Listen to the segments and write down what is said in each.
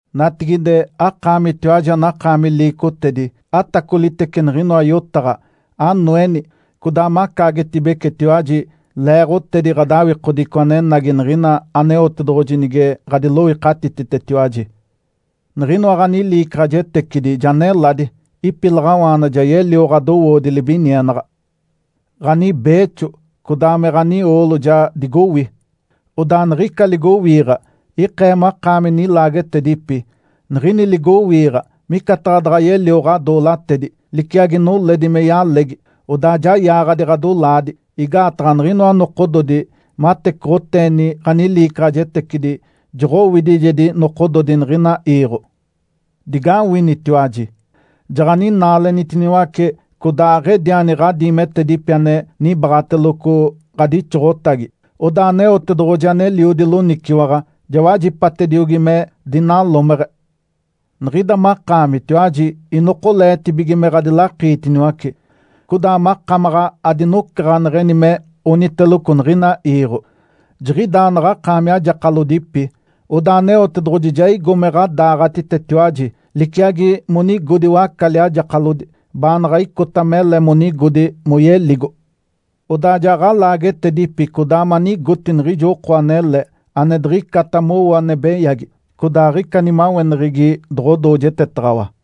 Natigide, akaamitiwaji anakaami liicotedi, atacolitece niɡ̶inoa yotaɡ̶a! Anoeni, codaa macaagetibecetiwaji leeɡ̶otedi ɡ̶adawikodico anenagi niɡ̶ina Aneotedoɡ̶oji nige ɡ̶adiloikatititetiwaji. Niɡ̶inoa ɡ̶aniliicaɡ̶ajetecidi ja neladi. Ipilaɡ̶awaana ja yelio ɡ̶adowoodi libinienaɡ̶a. Ǥanibeexo codaa me ɡ̶anioolo ja digowi. Odaa niɡ̶ica ligowiiɡ̶a ikee makaami nilaagetedipi. Niɡ̶ini ligowiiɡ̶a micataɡ̶a daɡ̶a yelio ɡ̶adoolatedi, liciagi noledi me yalegi, odaa ja yaaɡ̶adi ɡ̶adolaadi. Igaataɡ̶a niɡ̶inoa nokododi matecoɡ̶oteeni ɡ̶aniliicaɡ̶ajetecidi joɡ̶owidijedi nokododi niɡ̶ina iiɡ̶o. Digawinitiwaji! Jaɡ̶aninaalenitiniwace codaa aɡ̶ediani ɡ̶adiimetedipi ane nibaaɡ̶ateloco ɡ̶adixoɡ̶otagi. Odaa Aneotedoɡ̶oji aneliodi loniciwaɡ̶a ja wajipatediogi me dinalomeɡ̶e. Niɡ̶ida makaamitiwaji inokoleetibige me ɡ̶adilakiitiniwace, codaa makamaɡ̶a adinocaɡ̶aneɡ̶eni me oniteloco niɡ̶ina iiɡ̶o. Jiɡ̶idaa naɡ̶akaami ajakalodipi, odaa Aneotedoɡ̶oji ja igo me ɡ̶adaaɡ̶atitetiwaji, liciagi monigodi wacali ajakalodi baanaɡ̶a icota mele monigodi moyeligo. Odaa ja ɡ̶alaagetedipi codaa manigoti niɡ̶ijo oko anele, ane diɡ̶icata mowo ane beyagi, codaa aɡ̶ica nimaweneɡ̶egi doɡ̶odoojetetaɡ̶awa.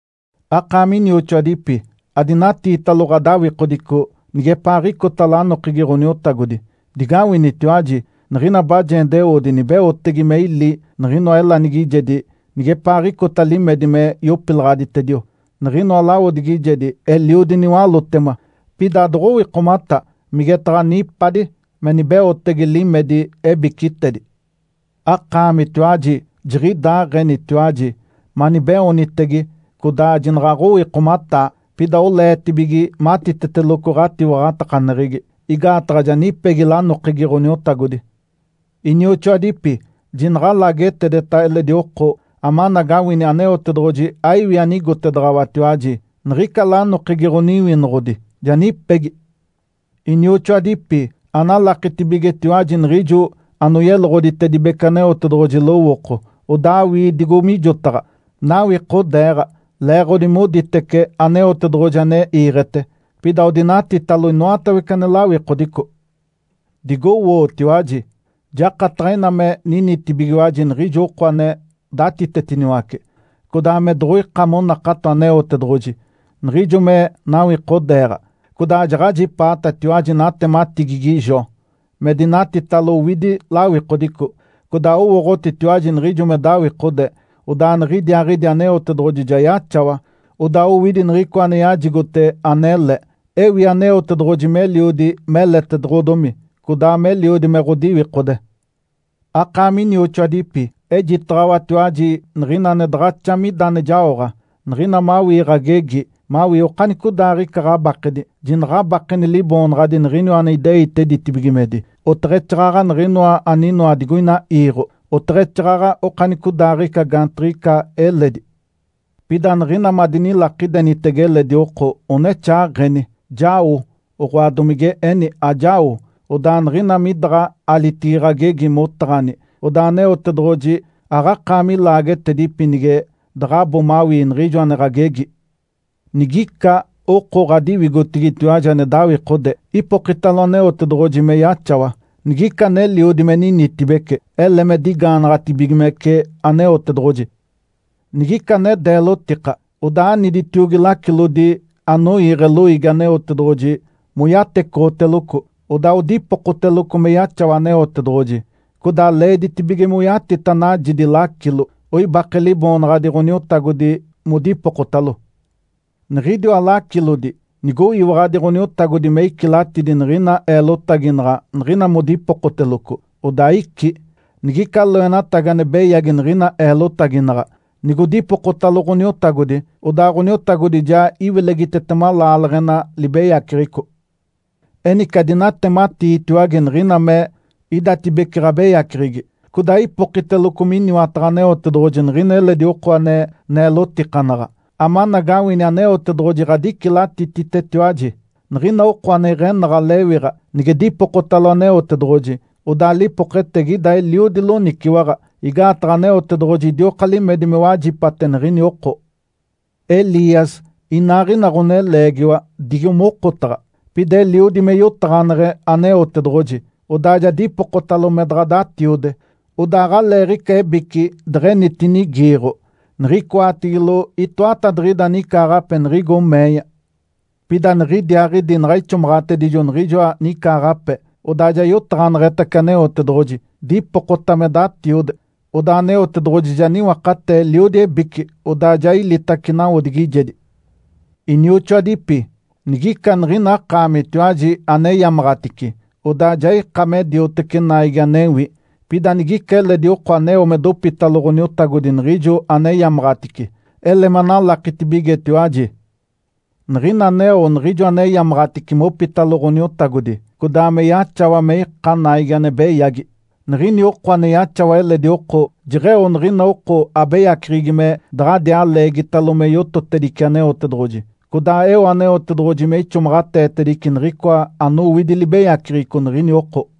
Akaami inioxoadipi, adinatiitalo ɡ̶adawikodico nigepaaɡ̶icota lanokegi Ǥoniotagodi. Digawinitiwaji! Niɡ̶ina bajendeoodi nibeotege me ili niɡ̶inoa elanigijedi nigepaaɡ̶icota limedi me yopilaɡ̶aditedio. Niɡ̶inoa lawodigijedi eliodi niwalótema, pida adoɡ̶owikomata migetaɡ̶a nipadi me nibeotege limedi ebicitedi. Akaamitiwaji jiɡ̶idaaɡ̶enitiwaji, manibeoonitege codaa jinaɡ̶aɡ̶owikomataa. Pida oleetibige matiteteloco ɡ̶atiwaɡ̶atakaneɡ̶egi, igaataɡ̶a ja nipegi lanokegi Ǥoniotagodi. Inioxoadipi, jinaɡ̶a alaagetedeta eledi oko amanagawini Aneotedoɡ̶oji aiwi anigotedaɡ̶awatiwaji. Niɡ̶ica lanokegi Ǥoniwinoɡ̶odi ja nipegi. Inioxoadipi, analakitibigetiwaji niɡ̶ijo anoyeloɡ̶oditedibece Aneotedoɡ̶oji lowooko, odaa awii digo mijotaɡ̶a. Nawikodeeɡ̶a leeɡ̶odi moditece Aneotedoɡ̶oji ane iiɡ̶ete, pida odinatitalo inoatawece ane lawikodico. Digowootiwaji! Jakataɡ̶a ina me ninitibigiwaji niɡ̶ijo oko ane datitetiniwace, codaa me doɡ̶oika monakato Aneotedoɡ̶oji, niɡ̶ijo me nawikodeeɡ̶a. Codaa jaɡ̶ajipaatatiwaji natematigigi Jó, me dinatitalo owidi lawikodico. Codaa owooɡ̶otitiwaji niɡ̶ijo me dawikode, odaa niɡ̶idiaaɡ̶idi Aneotedoɡ̶oji ja yaxawa, odaa owidi niɡ̶icoa ane yajigote anele. Ewi Aneotedoɡ̶oji meliodi meletedoɡ̶odomi, codaa meliodi me ɡ̶odiwikode. Akaami inioxoadipi, ejitaɡ̶awatiwaji niɡ̶ina ane daɡ̶axa mida ane jaoɡ̶a. Niɡ̶ina mawii ɡ̶agegi mawii okanicodaaɡ̶ica ɡ̶abakedi, jinaɡ̶abakeni liboonaɡ̶adi niɡ̶iniwa ane ideite ditibigimedi, oteɡ̶exaaɡ̶aɡ̶a niɡ̶inoa aninoa digoina iiɡ̶o, oteɡ̶exaaɡ̶aɡ̶a okanicodaaɡ̶ica gaantiɡ̶ica eledi. Pida niɡ̶ina madinilakidenitege eledi oko, onexaaɡ̶eni, “Jao!”, oɡ̶oa domige eni, “Ajao!” Odaa niɡ̶ina midaɡ̶a alitigi ɡ̶agegi motaɡ̶ani, odaa Aneotedoɡ̶oji aɡ̶akaami laagetedipi nige daɡ̶abo mawii niɡ̶ijo ane ɡ̶agegi. Nigica oko ɡ̶adiwigotigitiwaji ane dawikode, ipokitalo Aneotedoɡ̶oji me yaxawa. Nigica aneliodi me ninitibece, ele me digaanaɡ̶atibigimece Aneotedoɡ̶oji. Nigica ane deelotika, odaa aniditiogi lacilodi anoiiɡ̶e loiigi Aneotedoɡ̶oji moyatecoɡ̶oteloco, odaa odipokoteloco me yaxawa Aneotedoɡ̶oji. Codaa leeditibige moyatita najidi lacilo, oibake Liboonaɡ̶adi Ǥoniotagodi modipokotalo. Niɡ̶idiwa lacilodi nigoyiwaɡ̶adi Ǥoniotagodi me icilatidi niɡ̶ina eelotaginaɡ̶a niɡ̶ina modipokoteloco, odaa icí. Nigica loenatagi ane beyagi niɡ̶ina eelotaginaɡ̶a, nigodipokotalo Ǥoniotagodi, odaa Ǥoniotagodi ja iwilegitetema laaleɡ̶ena libeyaceɡ̶eco. Enice adinatematiitiwage niɡ̶ina me idatibece ɡ̶abeyaceɡ̶egi, codaa ipokiteloco miniwataɡ̶a Aneotedoɡ̶oji niɡ̶ina eledi oko ane neelotikanaɡ̶a, amanagawini Aneotedoɡ̶oji ɡ̶adicilatititetiwaji. Niɡ̶ina oko ane iɡ̶enaɡ̶a lewiɡ̶a nige dipokotalo Aneotedoɡ̶oji, odaa lipoketegi ida eliodi loniciwaɡ̶a, igaataɡ̶a Aneotedoɡ̶oji idioka limedi me wajipate niɡ̶ini oko. Elias inaaɡ̶ina ɡ̶oneleegiwa digo mokotaɡ̶a. Pida eliodi me yotaɡ̶aneɡ̶e Aneotedoɡ̶oji. Odaa ja dipokotalo me daɡ̶a datiode. Odaa aɡ̶aleeɡ̶ica ebici deɡ̶enitinigiiɡ̶o niɡ̶icoatigilo itoatadiɡ̶ida nicaaɡ̶ape niɡ̶igo meeya. Pida niɡ̶idiaaɡ̶idi naɡ̶a ixomaɡ̶atedijo niɡ̶ijoa nicaaɡ̶ape, odaa ja yotaɡ̶aneɡ̶etace Aneotedoɡ̶oji, dipokota me datiode. Odaa Aneotedoɡ̶oji ja niwakatee eliodi ebici, odaa ja ilitace nawodigijedi. Inioxoadipi, nigica niɡ̶ina akaamitiwaji aneyamaɡ̶atice, odaa ja ika me dioteci naigi anewi, pida nigica eledi oko aneo mopitalo Ǥoniotagodi niɡ̶ijo aneyamaɡ̶atice, ele manalakitibigetiwaji, niɡ̶ina aneo niɡ̶ijo aneyamaɡ̶atice mopitalo Ǥoniotagodi, codaa me yaxawa me ika naigi ane beyagi, niɡ̶ini oko ane yaxawa eledi oko jeɡ̶eo niɡ̶ina oko abeyaceɡ̶egi me daɡ̶adiaa leegitalo me yototedice Aneotedoɡ̶oji, codaa eo Aneotedoɡ̶oji me ixomaɡ̶ateetedice niɡ̶icoa anowidi libeyaceɡ̶eco niɡ̶ini oko.